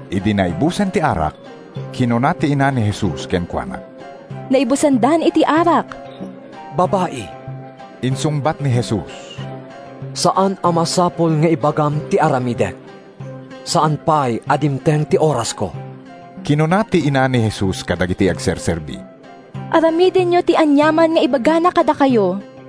Idi naibusen ti arak, kinuna ti ina ni Jesus kenkuana, “Naibusandan iti arak.” “Babai,” insungbat ni Jesus, “saan a masapul nga ibagam ti aramidek. Saan pay a dimteng ti orasko.” Kinuna ti ina ni Jesus kadagiti agserserbi, “Aramidenyo ti aniaman nga ibagana kadakayo.”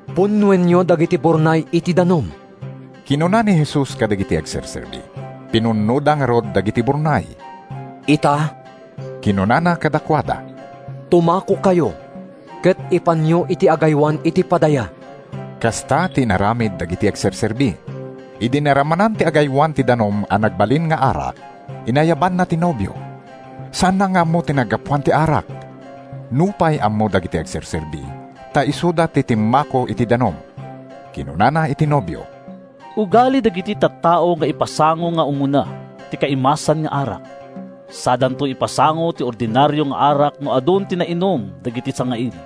“Punnoenyo dagiti burnay iti danum,” kinuna ni Jesus kadagiti agserserbi. Pinunnoda ngarud dagiti burnay. “Ita,” kinunana kadakuada, “tumakokayo ket ipanyo iti agaywan iti padaya.” Kasta ti inaramid dagiti agserserbi. Idi naramanan ti agaywan ti danum a nagbalin nga arak, inayabanna ti nobio. Saanna nga ammo ti naggapuan ti arak (nupay ammo dagiti agserserbi, ta isuda ti timmako iti danum). Kinunana iti nobio, “Ugali dagiti tattao nga ipasango nga umuna ti kaimasan nga arak sadanto ipasango ti ordinario nga arak no adun ti nainum dagiti sangaili.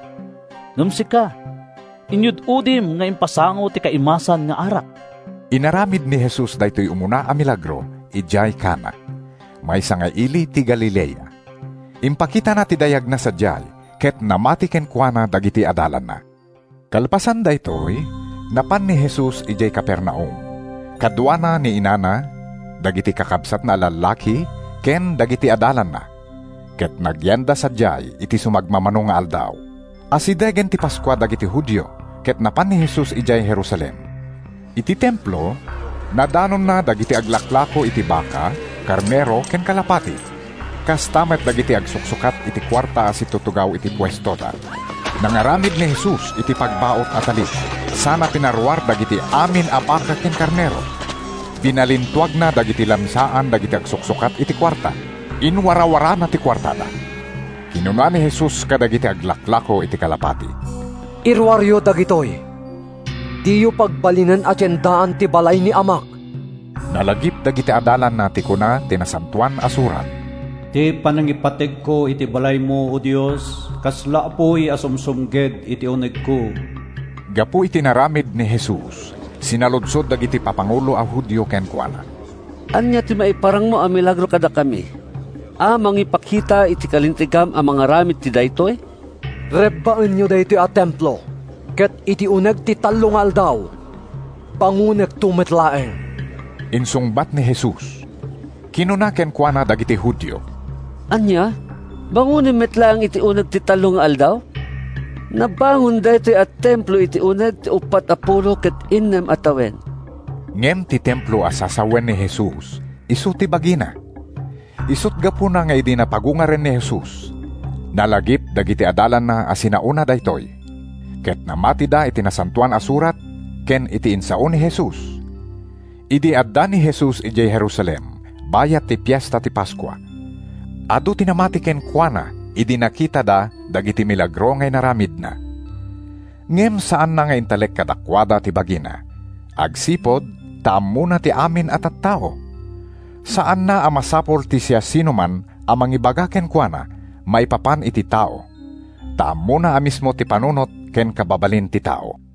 Ngem sika, inyud-udim nga impasango ti kaimasan nga arak!” Inaramid ni Jesus daytoy umuna a milagro idiay Cana, maysa nga ili ti Galilea. Impakitana ti dayagna sadiay, ket namati kenkuana dagiti adalanna. Kalpasan daytoy, napan ni Jesus idiay Capernaum. Kaduana ni inana, dagiti kakabsatna a lallaki ken dagiti adalanna ket nagyanda sadiay iti sumagmamano nga aldaw. Asidegen ti Paskua dagiti Judio, ket napan ni Jesus idiay Jerusalem. Iti Templo, nadanonna dagiti aglaklako iti baka, karnero ken kalapati, kasta met dagiti agsuksukat iti kuarta a situtugaw iti puestoda. Nangaramid ni Jesus iti pagbaut a tali sana pinaruar dagiti amin a baka ken karnero. Binalintuagna dagiti lamisaan dagiti agsuksukat iti kuarta. Inwarawarana ti kuartada. Kinuna ni Jesus kadagiti aglaklako iti kalapati. “Iruaryo dagitoy. Diyo pagbalinen a tiendaan ti balay ni Amak!” Nalagip dagiti adalanna ti kuna ti Nasantoan a Surat: “Ti panangipategko iti balaymo, O Dios, kasla apuy a sumsumged iti unegko!” Gapu iti inaramid ni Jesus, sinaludsod dagiti papangulo a Judio kenkuana, “Ania ti maiparangmo a milagro kadakami a mangipakita iti kalintegam a mangaramid iti daytoy?” “Rebbaenyo daytoy a Templo ket iti uneg ti tallo nga aldaw, bangonekto met laeng,” insungbat ni Jesus. Kinuna kenkuana dagiti Judio, “Ania? Bangonem met laeng iti uneg ti tallo nga aldaw? Nabangon daytoy a Templo iti uneg ti uppat a pulo ket innem a tawen!” Ngem ti templo a sasawen ni Jesus isu ti bagina. Isut’ gapuna nga idi napagungaren ni Jesus, nalagip dagiti adalanna a sinaona daytoy. Ket namatida iti Nasantoan a Surat ken iti insao ni Jesus. Idi adda ni Jesus idiay Jerusalem bayat ti Fiesta ti Paskua, adu ti namati kenkuana idi nakitada dagiti milagro nga inaramidna. Ngem saanna nga intalek kadakuada ti bagina, agsipud ta ammona ti amin a tattao. Saanna a masapul ti siasinoman a mangibaga kenkuana maipapan iti tao ta ammona a mismo ti panunot ken kababalin ti tao.